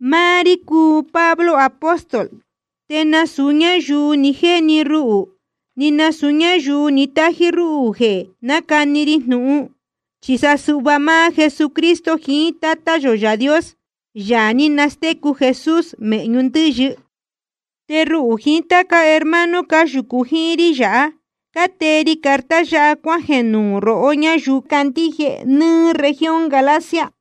Máá rí cúu Pablo apóstol. Te nasūu ñáyuu ni jéni ruhū ni nasūu ñáyuu ni tájí rúhū jeē nácani ri jnūhun, chi sa suhva máá Jesucristo jiín Tátá yō Yaā Dios, Yaā ní nastécu Jesús mēhñu ndɨ́yɨ. Te ruhū jiín táca hermano cáyūcu jíín rí yāhá, cátee ri carta yáha cuájeē nuū rohó ñáyuu cácandíje nɨ́ɨ́ región Galacia.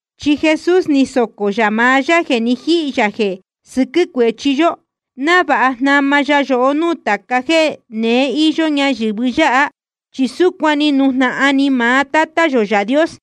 Chi Jesús ni socō yā maá yá jeē ni jíhī yā jeē sɨquɨ́ cuéchi yó, návāha jnama ya yohó núū tāca jéē neé íyó ñayɨ̄vɨ yáha, chi súcuan ni nujnahan ni maá Tátá yō Yaā Dios.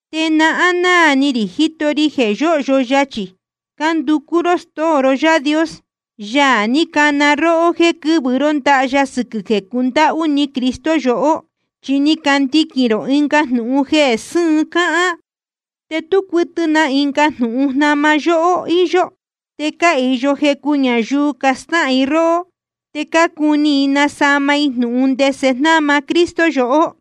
Te náhán náā ni rī jíto ri jeē yóhyo yachī cánducú ró stóo ró Yaā Dios, Yaā ní cana róhó jéē quɨ́vɨ ró ndaha ya sɨquɨ̄ jeē cundáhú ni Cristo yohó. Chi ni candiquīn rō ɨnga jnūhun jeē sɨ́ɨn cáhán. Te tú cuɨtɨ na ɨnga jnūhun jnama yóhó íyó. Te cáhīyo jecu ñayuu castáhān i róhó, te cácuni i nasama i jnūhun ndese jnáma Cristo yohó.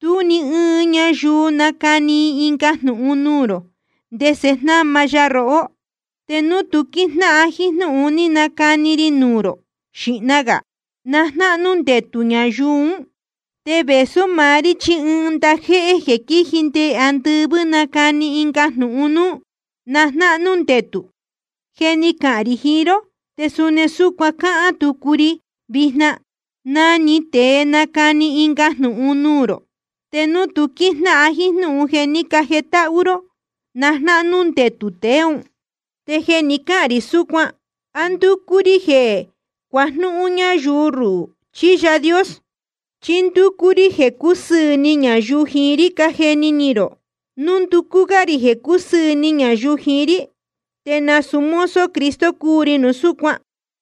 Te núu ɨɨn ñayuu nacani ɨnga jnūhun nuū rō ndese jnáma ya rohó, te núu tu quíjnáhan jíín jnúhun ni canacani ri nuū rō xīhna gā, na jnáhnú ndetū ñayuu ún. Te vēsú maá rí chí ɨɨn ndajéhé jeē quíji nde andɨvɨ́ nacani ɨnga jnūhun núú, na jnáhnú ndetū. Je ni cahān rī jiín ró, te suni súcuan cáhán tucu ri vijna: Na‑ni tēe nacani ɨnga jnūhun nuū rō, te núu tu quíjnáhan jíín jnúhun jeē ní cajetáhú ró, na jnáhnú ndetū tēe ún. Te jeē cahán rī súcuan, ¿á ndúcú rí jeē cuajnúhún ñáyuu ruhū, chí Yaā Dios? ¿Chí ndúcú rí jeē cúsɨɨ̄ ni ñayuu jiín rí, cájeni ni rō? Núu ndúcú gá rī jeē cúsɨɨ̄ ni ñayuu jiín rí, te nasūu mozo Cristo cúu ri núu súcuan.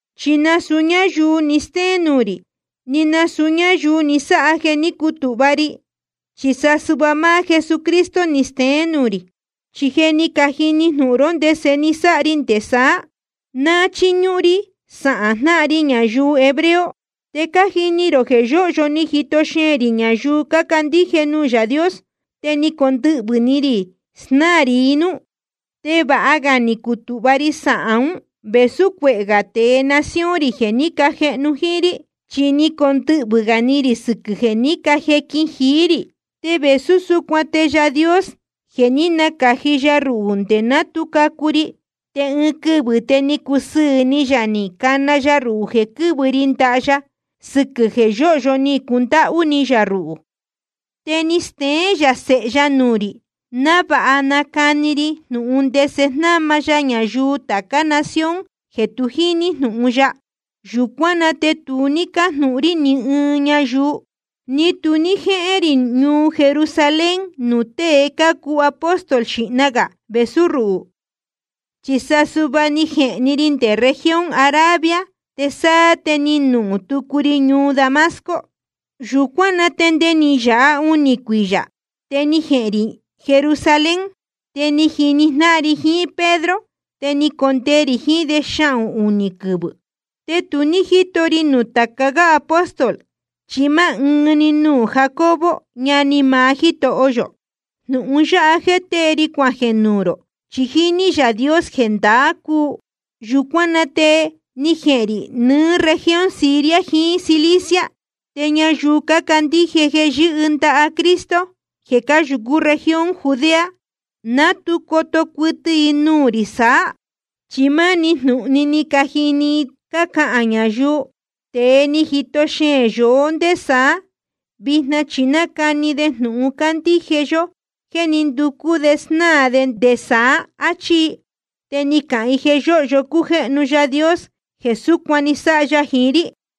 Chi nasūu ñáyuu ni stéén nuū rī, ni nasūu ñáyuu ni sáha jeē ní cutūhva ri, chi sa suhva máá Jesucristo ni steén nuū rī. Chi je ni cajini jnūhun ró ndese ni sáha ri nde saá, ná ni chiñúhún rí sahān jnáhan ri ñayuu hebreo. Te cájini rō jeē yōhyo ni jito xeēn rī ñayuu cácandíje nuū Yaā Dios, te ni condɨhvɨ̄ ni rī snáā rī i núú. Te vāha ga ni cutūhva ri sahān ún vēsú cuehē gā tēe nación rī jeē ní cajehnu jíín rí, chi ni condɨhvɨ̄ gā ni rī sɨquɨ̄ tāca jéē ní cajequin jií rī. Te vēsú súcuan te Yaā Dios je ni nacāji ya ruhū nde ná tu cacu ri, te ɨɨn quɨvɨ̄ te ni cusɨɨ̄ ni yā ni cana ya ruhū jeē quɨ́vɨ ri ndaha ya, sɨquɨ̄ jeē yóhyo ni cundáhú ni yā ruhū. Te ni steén yā Sēhe ya nuū rī, návāha nacani ri jnūhun ndese jnáma ya ñayuu tācá nación jeē tu jíní jnūhun ya. Yūcuán na te tu ní cájnūhun rí ni ɨɨn ñayuu, ni tu ní jéhén rī ñuu Jerusalén nuū tée cácuu apóstol xīhna gā vēsú ruhū. Chi sa suhva ni jehēn‑ni ri nde región Arabia, te sáá te ni nuhūn tucu ri ñuu Damasco. Yūcuán na te nde ni yāha unī cuiyā, te ni jehēn rī Jerusalén. Te ni jini jnáhan ri jiín Pedro, te ni condee rī jiín de xahūn‑ni quɨvɨ̄. Te tu ní jíto ri nuū tāca gá apóstol, chi máá ɨɨn‑ni nuū Jacobo ñani maá Jítoho yō. Jnūhun yáha jéē tée ri cuajeē nuū rō, chi jíní Yaā Dios jeē ndaā cúu. Yūcuán na te ni jehēn rī nɨɨ́ región Siria jiín Cilicia. Te ñayuu cácandíje jeē yɨ́hɨ ndaha Cristo, jeē cáyūcú región Judea, ná tu coto cuɨtɨ i nuū rī saá. Chi máni jnūhun‑ni ni cajini i cácahān ñayuu: Tēe ni jito xeēn yohó ndé saá, vijna chi nácani de jnūhun cándíje yó jéē ní nducú de snáā de nde saá, áchí i. Te ni cacahān i jeē yóhyo cújéhnu Yaā Dios jeē súcuan ni sáha ya jiín rí.